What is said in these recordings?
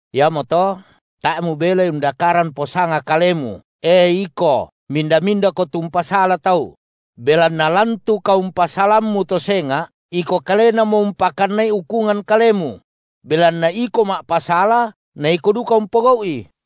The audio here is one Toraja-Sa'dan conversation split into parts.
Iamoto tae’ mubelai undakaran posanga kalemu, e iko, minda-mindako tu umpasala tau; belanna lan tu kaumpasalammu to senga’, iko kalenamo umpakannai ukungan kalemu; belanna iko ma’pasala na iko duka umpogau’i.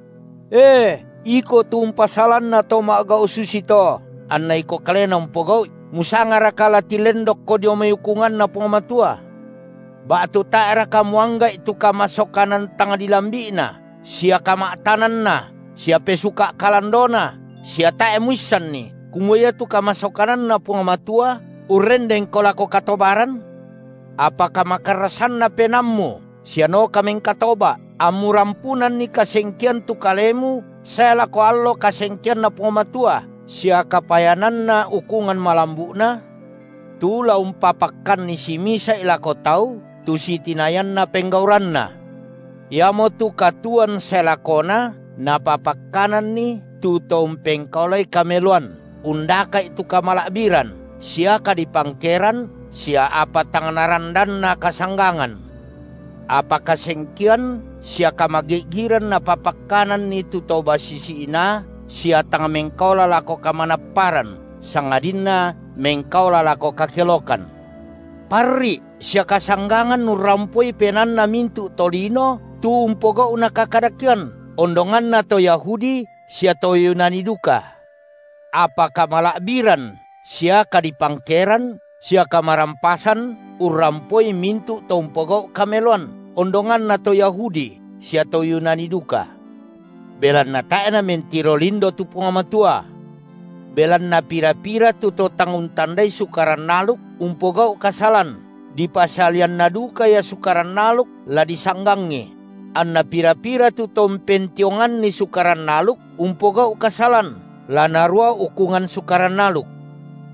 E iko tu umpasalanna to ma’gau’ susito anna iko kalena umpogau’i, musangaraka la tilendokko dio mai ukunganNa Puang Matua? Ba’tu tae’raka muangga’i tu kamasokanan tang dilambi’Na sia kama’tananNa sia pesuka’ kalandoNa sia tae’ muissanni, kumua iatu kamasokananNa Puang Matua urrendenko lako katobaran? Apa kamakarrasanna penaammu sia noka mengkatoba’, ammu rampunanni kasengkean tu kalemu sae lako allo kasengkeanNa Puang Matua sia kapayananna ukungan malambu’Na, tu la umpapakkanni simisa’i lako tau, tu sitinayanna penggauranna, iamotu katuoan sae lakona Napapakkananni tu to umpengkaolai kameloan undaka’i tu kamala’biran sia kadipangkeran sia apa tang narandanna kasanggangan, apa kasengkean sia kamagi’giran Napapakkananni tu to basisi inaa sia tang mengkaola lako kamanapparan sangadinna mengkaola lako kakelokan. Parri’ sia kasanggangan urrampoi penaanna mintu’ tolino tu umpogau’na kakadakean, ondonganna to Yahudi sia to Yunani duka; apa kamala’biran sia kadipangkeran sia kamarampasan urrampoi mintu’ to umpogau’ kameloan, ondonganna to Yahudi sia to Yunani duka. Belanna tae’ Namentiro lindo tu Puang Matua. Belanna pira-pira tu to tang untandai Sukaran aluk umpogau’ kasalan, dipasalianna duka ia Sukaran aluk la disanggangi; anna pira-pira tu to umpentionganni Sukaran aluk umpogau’ kasalan, la narua ukungan Sukaran aluk.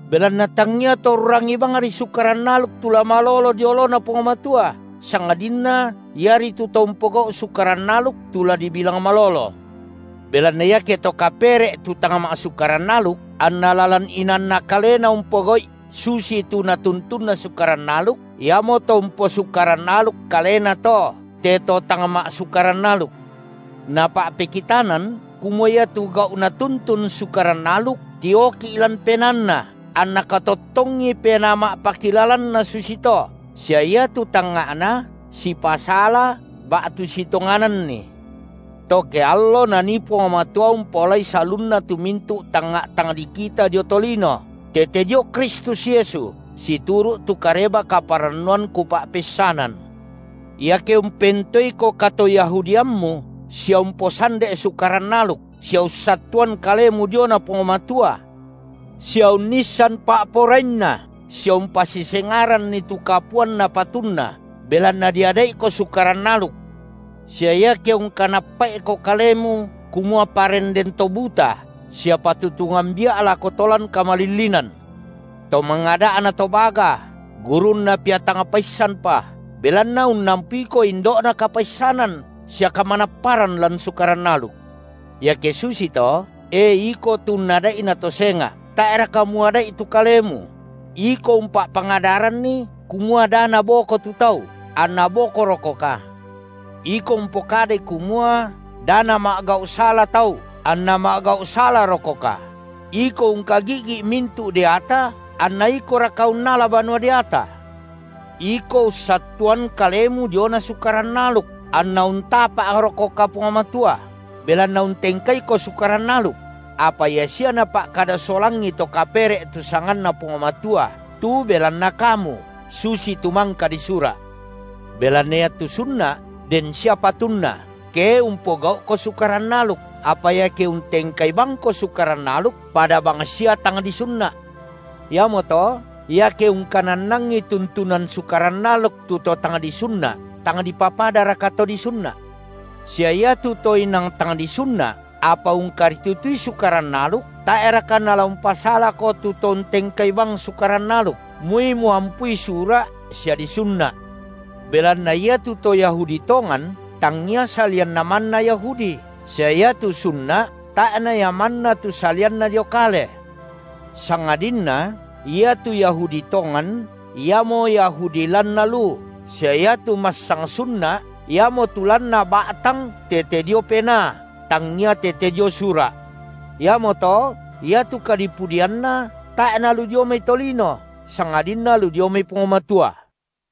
Belanna tangia to urrangi bangri Sukaran aluk tu la malolo dio oloNa Puang Matua, sangadinna iaritu to umpogau’ sukaran aluk tu la dibilang malolo. Belanna iake to kapere’ tu tang ma’sukaran aluk, anna lalan inaanna kalena umpogau’i susitu natuntunna Sukaran aluk, iamo to umposukaran aluk kalena to, te to tang ma’sukaran aluk. Napa’pekitanan, kumua iatu gau’ natuntun Sukaran aluk tioki’ lan penaanna, anna katottongi penaa ma’pakilalanna susito, sia iatu tangnga’na sipasala ba’tu sitongananni to ke allo Nanii Puang Matua umpaolai salunna tu mintu’ tangnga’ tang dikita dio tolino, tete dio Kristus Yesu, situru’ tu Kareba-kaparannuan kupa’peissanan. Iake umpentoeiko katoyahudiammu, sia umposande’ Sukaran aluk sia ussattuan kalemu diona Puang Matua, sia unnissan pa’porainNa sia umpasisengaranni tu kapuanna patunna, belanna diada’iko Sukaran aluk, sia iake ungkanappa’iko kalemu kumua perenden to buta sia patutungan bia’ lako to lan kamalillinan, to mangada’na to baga, gurunna pia tang paissanpa, belanna unnampuiko indo’na kapaissanan sia kamanapparan lan Sukaran aluk. Iake susito, e iko tu unnada’ina to senga’, tae’raka muada’i tu kalemu? Iko umpa’pangadaranni, kumua dana bako tu tau, anna bokorokoka? Iko umpokadai kumua: da nama’gau’ sala tau anna ma’gau’ salarokoka? Iko ungkagi’gi’ mintu’ deata, anna ikoraka unnala banua deata? Iko ussattuan kalemu diona Sukaran aluk, anna untapa’rokoka Puang Matua, belanna untengkaiko Sukaran aluk? Apa ia sia napa’kada solangi to kapere’ tu sanganNa Puang Matua tu belanna kamu, susitu mangka disura’. Belanna iatu sunna’ den sia patunna, ke umpogau’ko Sukaran aluk, apa iake untengkai bangko Sukaran aluk, pada bang sia tang disunna’. Iamoto, iake ungkanannangi tuntunan Sukaran aluk tu to tang disunna’ tang dipapadaraka to disunna’? Sia iatu to inang tang disunna’, apa ungkaritutui Sukaran aluk, tae’raka nala umpasalako tu to untengkai bang Sukaran aluk, moi muampui sura’ sia disunna’. Belanna iatu to Yahudi tongan, tangia salianna manna Yahudi, sia iatu sunna’ tae’ na ia manna tu salianna dio kale; sangadinna iatu Yahudi tongan, iamo Yahudi lanna lu, sia iatu massang sunna’ iamotu lanna ba’tang tete dio Penaa, tangia tete dio sura’. Iamoto iatu kadipudianna tae’ nalu dio mai tolino, sangadinna lu dio mai Puang Matua.